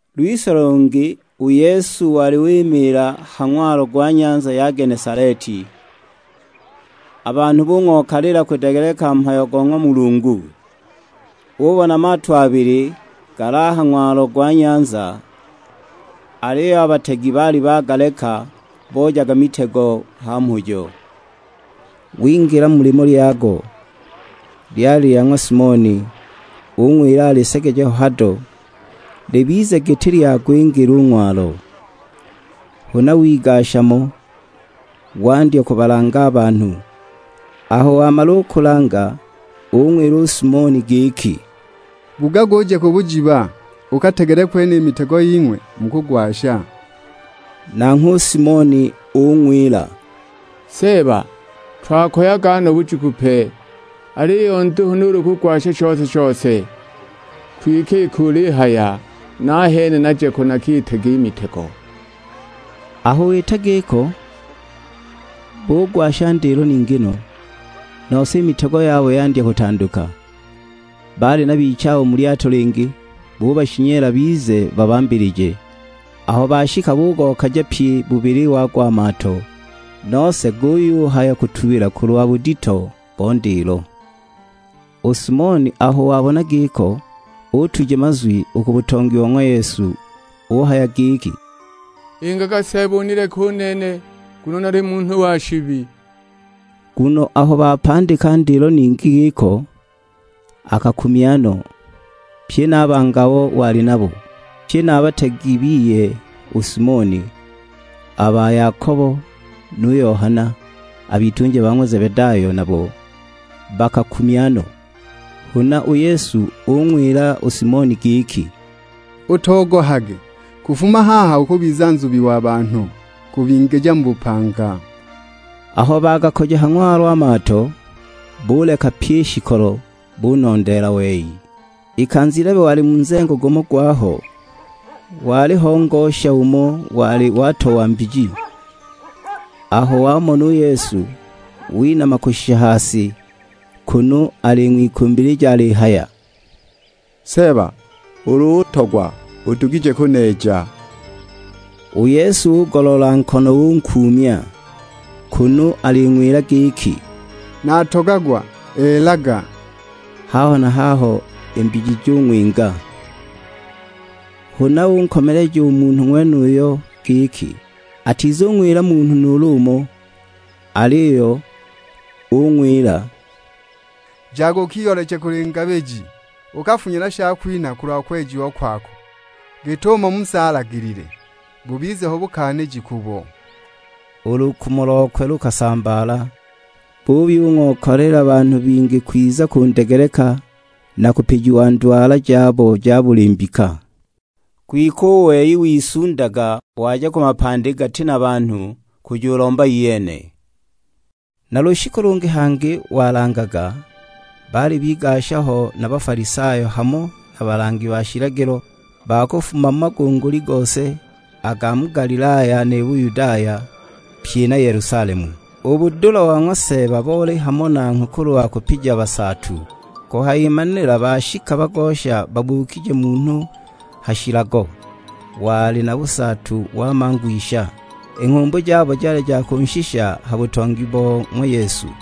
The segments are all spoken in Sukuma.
Lwise lungi u Yesu wali wimiila ha ng'walo gwa nyanza ya Genesaleti, a banhu bung'okaliila kudegeleka mhayo go ng'wa Mulungu. Ubona mato abili gali a ha ng'walo gwa nyanza; aliyo a bategi baali bagaleka, boojaga mitego ha mhujo. Wingila mu limo lyago, lyali lya ng'wa Simoni, ung'wila alisegeje ho hado, libize giti lyagwingila u ng'walo. Huna wigasha mo, wandya kubalanga a banhu. Aho wamala u kulanga ung'wila u Simoni giki, "Bugaga uje ku bujiba, ukategele kwene i mitego ying'we, mukugwasha." Nanghwe u Simoni ung'wila, "Seeba twakoyaga no bujiku pe, aliyo nduhu nuulu kugwasha shose-shose; kwike iki ulihaya, nahene naje ko nakitege i mitego." Aho wita giko bugwasha ndilo ningi no, nose i mitego yabo yandya kutanduka! Baali na bichabo mu lyato lingi, bubashinyela bize babambilije. Aho bashika bugokaja pyi bubili wago a mato, nose guyuhaya kutubila kulwa budito bo ndilo! U Simoni aho wabona giko, utuja mazwi u ku butongi bo ng'wa Yesu uhaya giki, "Ingaga Seeba unileke u nene, nguno nali munhu wa shibi!" Nguno aho bapandika ndilo ningi giko, akakumya no, pye na a bangi abo wali nabo. Pye na a bategi biye u Simoni, a ba Yakobo nu Yohana, a bitunja ba ng'wa Zebedayo nabo bakakumya no. Huna u Yesu ung'wila u Simoni giki, "Utogohage; kufuma haha ukubiza nzubi wa banhu, kubingija mu bupanga." Aho bagakoja ha ng'walo a mato, buleka pyi i shikolo, bunondeela wei. Ikanza ilebe wali mu nzengo gumo gwaho, waliho ngosha umo wali watowa mbiji, aho wamona u Yesu, winama kushisha ha si; kunu aling'wikumbilija alihaya, "Seeba ulu utogwa udugije kuneeja!" U Yesu ugoloola nkono unkuumya; kunu aling'wila giki, "Natogagwa elaga!" Haho na haho i mbiji jung'winga. Huna unkomeleja u munhu ng'wenuyo giki atizung'wila munhu nuulu umo, aliyo ung'wila, "Jaga ukiyooleche kuli ngabiji, ukafunye na shakwinha kulwa kwejiwa kwako, git'umo Musa alagilile; bubize ho bukaaniji kubo." U lukumo lokwe lukasambaala, buyung'okaliila banhu bingi kwiza kundegeleka, na kupijiwa ndwala jabo ja buli mbika. Kwike u wei wisundaga waja ku mapandi gati na banhu, kujulomba iyene. Na lushiku lungi hangi walangaga, baali bigasha ho na Bafalisayo hamo na balangi ba shilagilo, ba kufuma mu magunguli gose, a ga mu Galilaya, ni Buyudaya; pye na Yelusalemu. U budula bo ng'wa Seeba boli hamo nanghwe kulwa kupija basaatu. Kuhayimanila bashika bagosha babuukije munhu ha shilago, wali na busaatu wa mangwisha; i nghumbu jabo jali kunshisha ha butongi bo ng'wa Yesu.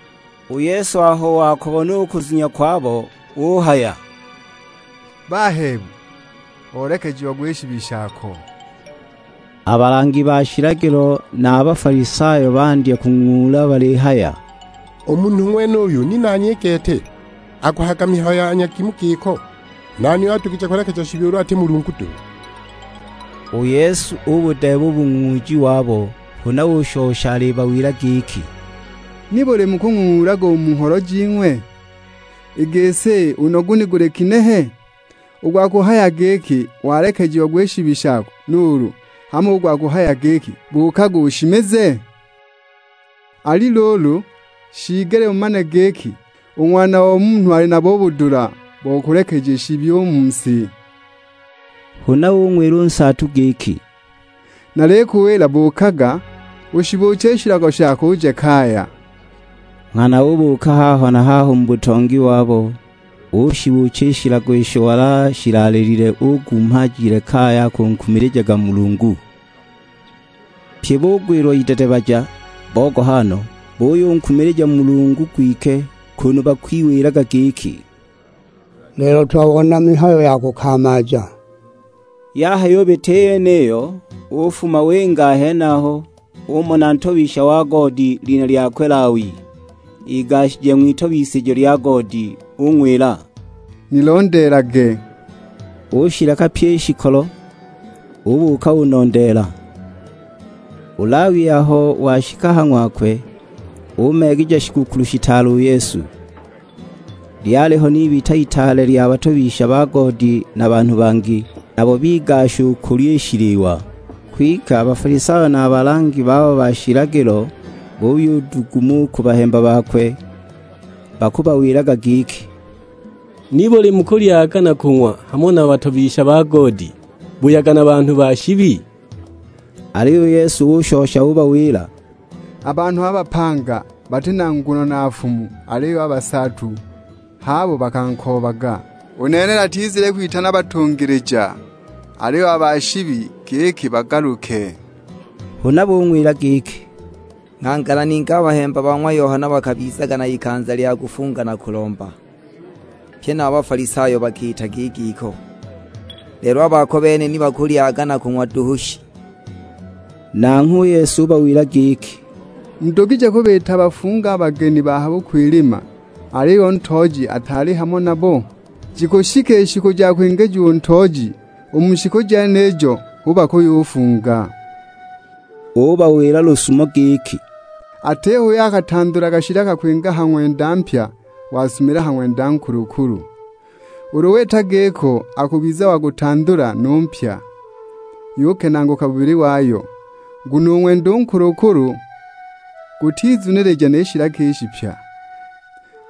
U Yesu aho wakubona u kuzunya kwabo, uhaya, "Bahebu, olekejiagwa i shibi shako." A balangi ba shilagilo na a Bafalisayo bandya kung'ung'uula balihaya, "U munhu ng'wenuyu ni nani i gete aguhayaga mihayo ya nyagimu giko? Nani uyo adugije kulekeja shibi ulu ati Mulungu duhu!" U Yesu ubudeeba u bung'ung'uuji wabo, huna ushosha alibawila giki, "Nibuli mukung'ung'uulaga u mu ngholo jing'we? I gisi, u nogu ni guli ginehe? U gwa kuhaya giki, 'Walekejiagwa i shibi shako;' nuulu hamo u gwa kuhaya giki, 'Buukaga ushimize?' Ali luulu, shiigelile mumane giki u Ng'wana o Munhu ali nabo u budula bo kulekeja shibi u mu si." Huna ung'wila u nsaatu giki, "Nalikuwila buukaga, ushibuuche i shilago shako uje kaya." Nghana ubuuka haho na haho mu butongi wabo, ushibuucha i shilago isho wali ashilaalilile, ugumha ajile kaya akunkumilijaga Mulungu. Pye bugwilwa idedebaja, bogoha no; buyunkumilija Mulungu gwike, kunu bakwiwilaga giki, "Lelo twabona mihayo ya kukamaaja!" Yahayubita i yeniyo, ufuma winga a henaho; umona ntobisha wa goodi, lina lyakwe Lawi, igashije ng'witobisijo lya goodi; ung'wila, "Nilondeelage." Ushileka pyi i shikolo, ubuuka unondeela. U Lawi aho washika ha ng'wakwe umeegeja shigukulu shitaale u Yesu. Lyaliho n'ibita itaale lya batobisha ba goodi na banhu bangi; nabo bigasha u kulya i shiliwa. Kwike a Bafalisayo na a balangi babo ba shilagilo buyuduguma u ku bahemba bakwe; bakubawilaga giki, "Nibuli mukulyaga na kung'wa hamo na batobisha ba goodi, buyaga na banhu ba shibi?" Aliyo u Yesu ushosha ubawila, "A banhu a bapanga bati na nguno na nfumu, aliyo a basaatu h'abo bakankoobaga. U nene natizile kwitana batungilija, aliyo ba shibi; giki bagaluke." Huna bung'wila giki, "Nghangala ningi a bahemba ba ng'wa Yohana bakabizaga na ikanza lya kufunga na kulomba, pye na a ba Bafalisayo bakiitaga i giko; lelo a bako bene ni bakulyaga na kung'wa duhu shi!" Nanghwe u Yesu ubawila giki, "Mudugije kubiita bafunge a bageni ba ha bukwilima, aliyo nu ntooji ataali hamo nabo? Jikushika i shiku ja kwingijiwa u ntooji, u mu shiku jenijo hu bakuyufunga!" Ubawila lusumo giki. "Atiho uyo akatandulaga shilaka kwinga ha ng'wenda mpya wasumiila ha ng'wenda nkulukulu. Ulu wita giko akubiza wagutandula nu mpya, yukenaaguka bubili wayo; nguno u ng'wenda u nkulukulu gutizunilija ni shilaka i shipya.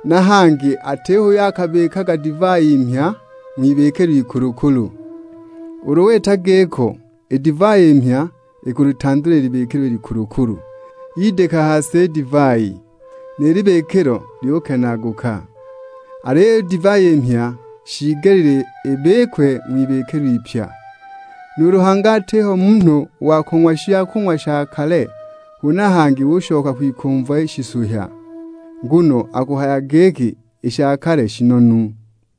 Na hangi atiho uyo akabikaga divai mhya ng'wibikilo ikulukulu, ulu wita giko, i divai i mhya ikulitandula i libikilo i likulukulu; yidika ha si i divai, ni libikilo lyukenaaguka. Aliyo i divai i mhya shiigelile ibikwe ng'wibikilo ipya. Nuulu hangi atiho munhu wa kung'wa shakung'wa sha kale huna hangi ushoka kwikumva shisuhya; nguno akuhaya giki i sha kale shinonu!"